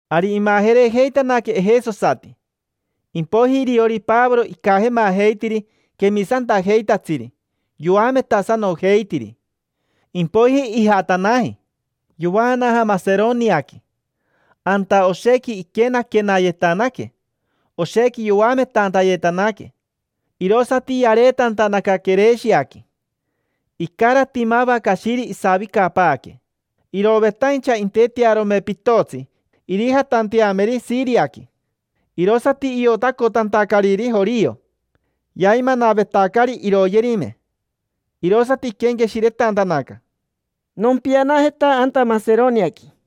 Ari imajerejeitanaque ejesosati. Impoiji iriori Pavoro icajemajeitiri quemisantajeitatsiri, yoametasanojeitiri. Impoiji ijatanaji, yovaanaja Maseroniaqui. Anta oshequi iquenaquenayetanaque, oshequi yoametantayetanaque. Irosati yareetantanaca Quireshiaqui. Icarati mava cashiri isavicapaaque. Irovetaincha intetearome pitotsi irijatanteameri Shiriaqui. Irosati iotacotantacariri jorio, yaimanavetacari iroyerime. Irosati iquenqueshiretantanaca: —Nompianajeta anta Maseroniaqui.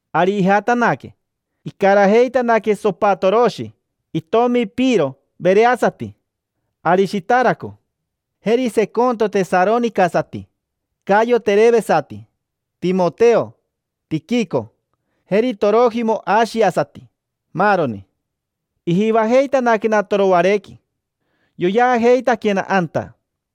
Ari ijatanaque, icarajeitanaque Sopatoroshi itomi Piro vereasati, Arishitaraco, jeri Seconto tesaronicasati, Cayo terevesati, Timoteo, Tiquico, jeri Torojimo ashiasati, maaroni. Ijivajeitanaquena Toroarequi, yoyeajeitaquena anta.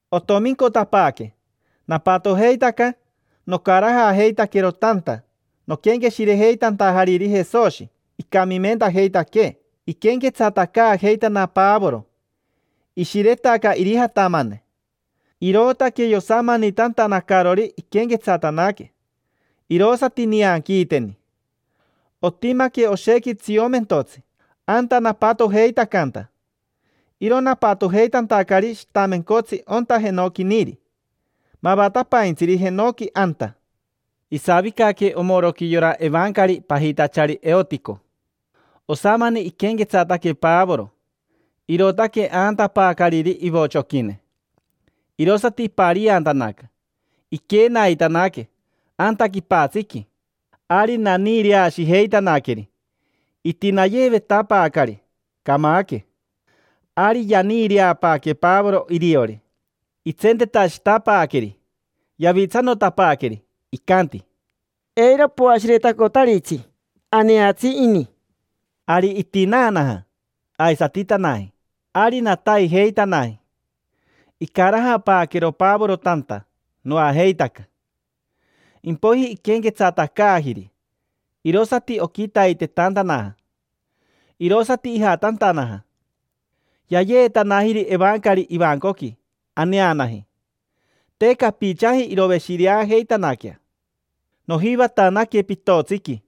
Otomincotapaaque. Napatojeitaca nocarajajeitaquero tanta noquenqueshirejeitantajariri Jesoshi icamimentajeitaquee. Iquenquetsatacaajeitana Pavoro. Ishiretaca irijatamane, irootaque yosamanitantanacarori iquenquetsatanaque, vero, vero. Irosati nianquiiteni. Otimaque oshequi tsiomentotsi anta napatojeitacanta. Iro napatojeitantacari shitamencotsi onta jenoquiniri; mavatapaintsiri, jenoqui anta. Isavicaque omoroqui yora evancari pajitachari Eotico. Osamani iquenquetsataque Pavoro, irootaque aantapaacariri ivochoquine. Irosati ipariantanaca: iquenaitanaque, sheroo, tirin, anta quipatsiqui. Ari naniireashijeitanaqueri, itinayeevetapaacari; camaque ini, torein. Ari yaniireapaaque Pavoro iriori. Itsentetashitapaaqueri, yavitsanotapaaqueri. Icanti: —Eiro poashiretacotaritsi: aneatsi ini. Ari itinaanaja, aisatitanaji. Ari nataijeitanaji, icarajapaaquero Pavoro tanta, noajeitaca. Impoiji iquenquetsatacaajiri, irosati oquitaitetantanaja. Irosati ijatantanaja. Yayeetanajiri evancari ivancoqui, aneanaji. Te capichaji iroveshireajeitanaquea. Nojivatanaque pitotsiqui,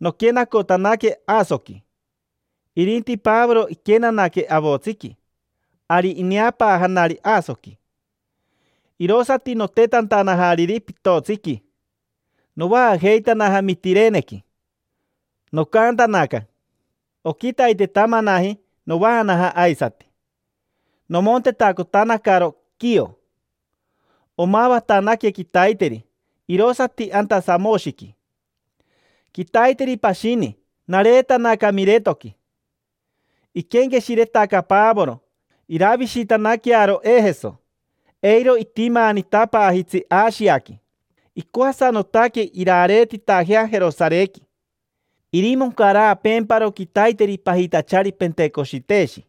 noquenacotanaque Asoqui; irinti Pavoro iquenanaque avotsiqui. Ari ineapaajanari Asoqui, irosati notetantanajariri pitotsiqui. Novaajeitanaja Mitirenequi, nocaantanaca, shiririri. Oquitaitetamanaji novaanaja aisati. Nomontetacotanacaro Quio. Omavatanaque quitaiteri, irosati anta Samoshiqui. Quitaiteri pashini nareetanaca Miretoqui. Iquenqueshiretaca Pavoro iravishitanaquearo Ejeso, eiro itimaanitapaajitsi Ashiaqui. Icoasanotaque irareetitajea Jerosarequi, irimoncaraapeemparo quitaiteri pajitachari Pentecoshiteshi.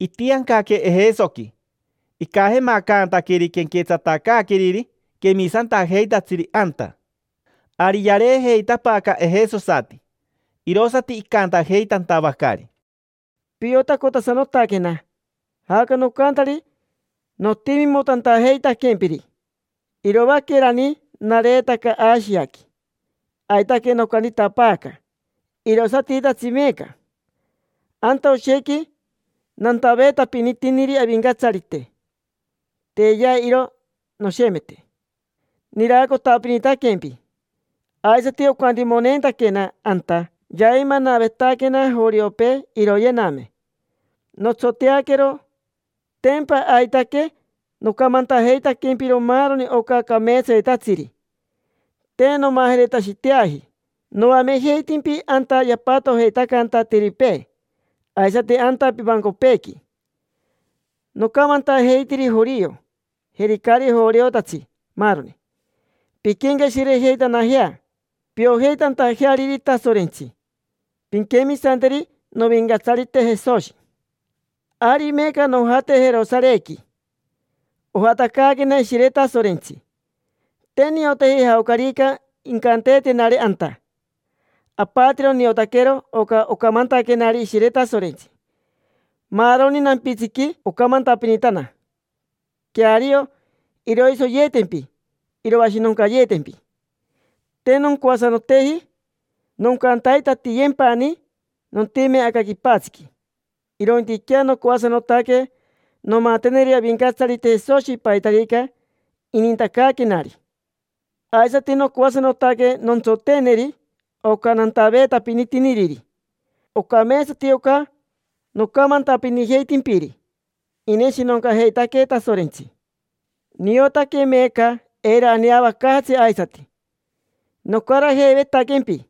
Itiancaque Ejesoqui, icajemacantaqueri quenquetsatacaaqueriri quemisantajeitatsiri anta. Ari yareejeitapaaca ejesosati, irosati icantajeitantavacari: —Piotacotasanotaquena jaoca nocantari notimimotantajeitaquempiri. Iroaquerani nareetaca Ashiaqui, aitaque nocantitapaaca, irosatitatsi meeca. Anta oshequi nantaveetapinitiniri Avincatsarite, teyea iro noshemete. Niraacotapinitaquempi. Aisati ocantimoneentaquena anta yaimanavetaquena joriopee iroyename. Notsoteaquero, tempa aitaque nocamantajeitaquempiro maaroni oca cameetsayetatsiri. Te nomajeretashiteaji. Noamejeitimpi anta yapatojeitacanta atiripee aisati anta pivancopeequi. Nocamantajeitiri jorio, jeri caari joriotatsi, maaroni: “Pinquenqueshirejeitanajea piojeitantajeariri Tasorentsi. Pinquemisanteri Novincatsarite Jesoshi”. Ari meeca nojate Jerosarequi, ojatacaanaquena Ishire Tasorentsi. Te nioteji jaocarica incanteetenari anta. Apatiro niotaquero oca ocamantaquenari Ishire Tasorentsi. Maaroni nampitsiqui ocamantapinitana: “Queario iroisoyeetempi, iroashinoncayeetempi”. Te noncoasanoteji noncantaitatiyempani nontime aca quipatsiqui, irointiquea nocoasanotaque nomateneri Avincatsarite Jesoshi paitarica inintacaaquenari. Aisati nocoasanotaque nontsoteeneri oca nantaveetapinitiniriri. Ocameetsati oca nocamantapinijeitimpiri: “Ineshinoncajeitaquee Tasorentsi”. Niotaque meeca eiro aneavacaajatsi aisati. Nocarajeivetaquempi,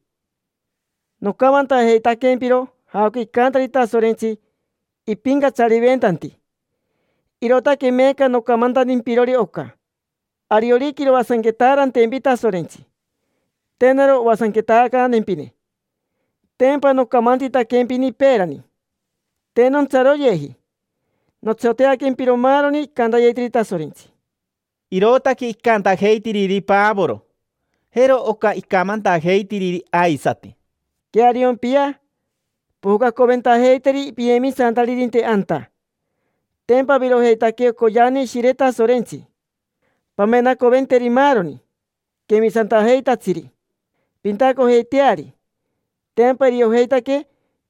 nocamantajeitaquempiro jaoca icantari Tasorentsi ipincatsariventanti. Irootaque meeca nocamantantimpirori oca. Ariorica iroasanquetaarantempi Tasorentsi, te naro oasanquetacantempine: tempa nocamantitaquempini peerani. Te nontsaroyeji, notsoteaquempiro maaroni icantayetiri Tasorentsi. Irootaque icantajeitiriri Pavoro. Jero oca icamantajeitiriri aisati: —Queariompia, pojocaacoventajeiteri piyemisantaririnte anta. Tempa avirojeitaque ocoyeane Ishire Tasorentsi. Pamenacoventeri maaroni quemisantajeitatsiri, pintacojeiteari. Tempa iriojeitaque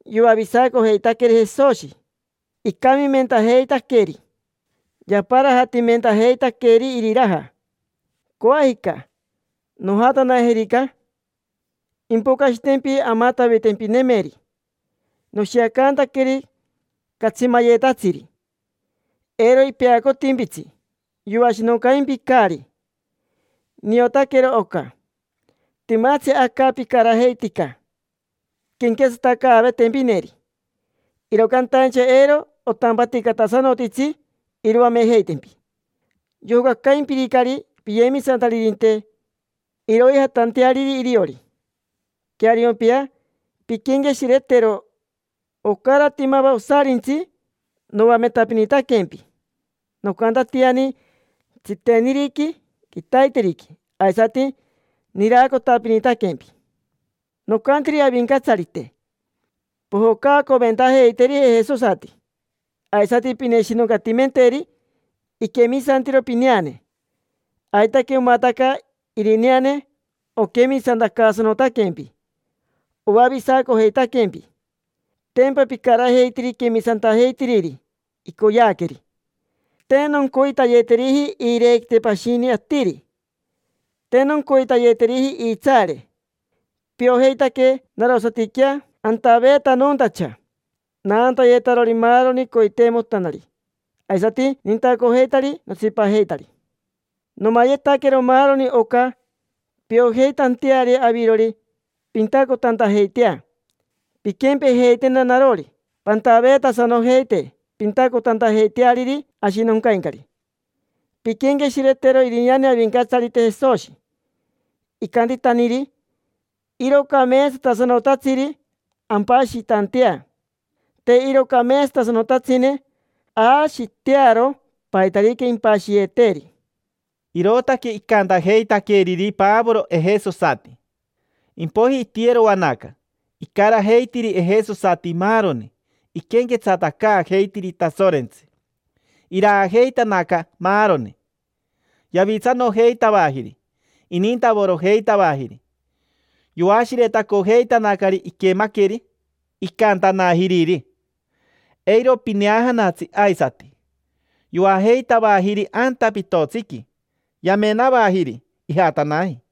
yoavisacojeitaqueri Jesoshi, icamimentajeitaqueri, yaparajatimentajeitaqueri iriraja. Coajica, nojatanajerica, impocashitempi amatavitempinemeri: noshiacantaqueri catsimayetatsiri. Eiro ipeacotimpitsi, yoashinoncaimpicari. Niotaquero oca. Timatsi aca picarajeitica quenquetsatacaavetempineri, iro cantaincha eiro otampaticatasanotitsi iroamejeitempi. Yojocacaimpiricari piyemisantaririnte, iroijatanteariri iriori. Queariompia, pinquenqueshiretero. Ocarati mava osarintsi noametapinitaquempi. Nocantatiani: tsiteniriqui, quitaiteriqui. Aisati niraacotapinitaquempi. Nocantiri Avincatsarite: “Pojocaacoventajeiteri ejesosati, aisati pineshinoncatimenteri iquemisantiro pineane”. Aitaque omataca irineane oquemisantacaasanotaquempi, oavisacojeitaquempi. Tempa picarajeitiri quemisantajeitiriri icoyeaqueri. Te noncoitayeteriji iirequite pashini atiri. Te noncoitayeteriji iitsaare. Piojeitaque narosatiquea antaveetanontacha, naantayetarori maaroni coiteimotanari, aisati nintacojeitari notsipajeitari. Nomayetaquero maaroni oca piojeitanteari avirori pintacotantajeitea. Pinquempejeitena narori, pantaveetasanojeite, pintacotantajeiteariri ashinoncaincari. Pinquenqueshiretero irineane Avincatsarite Jesoshi, icantitaniri: “Iro cameetsatasanotatsiri ampashitantea. Te iro cameetsatasanotatsine aashitearo paitarica impashiyeeteeri”. Irootaque icantajeitaqueriri Pavoro ejesosati. Impoiji itiyeroanaca, icarajeitiri ejesosati maaroni, iquenquetsatacaajeitiri Tasorentsi. Iraajeitanaca maaroni. Yavitsanojeitavajiri, inintavorojeitavajiri. Yoashiretacojeitanacari iquemaqueri icantanajiriri: “Eiro pineajanatsi aisati”. Yoajeitavajiri anta pitotsiqui, yamenavajiri ijatanaji.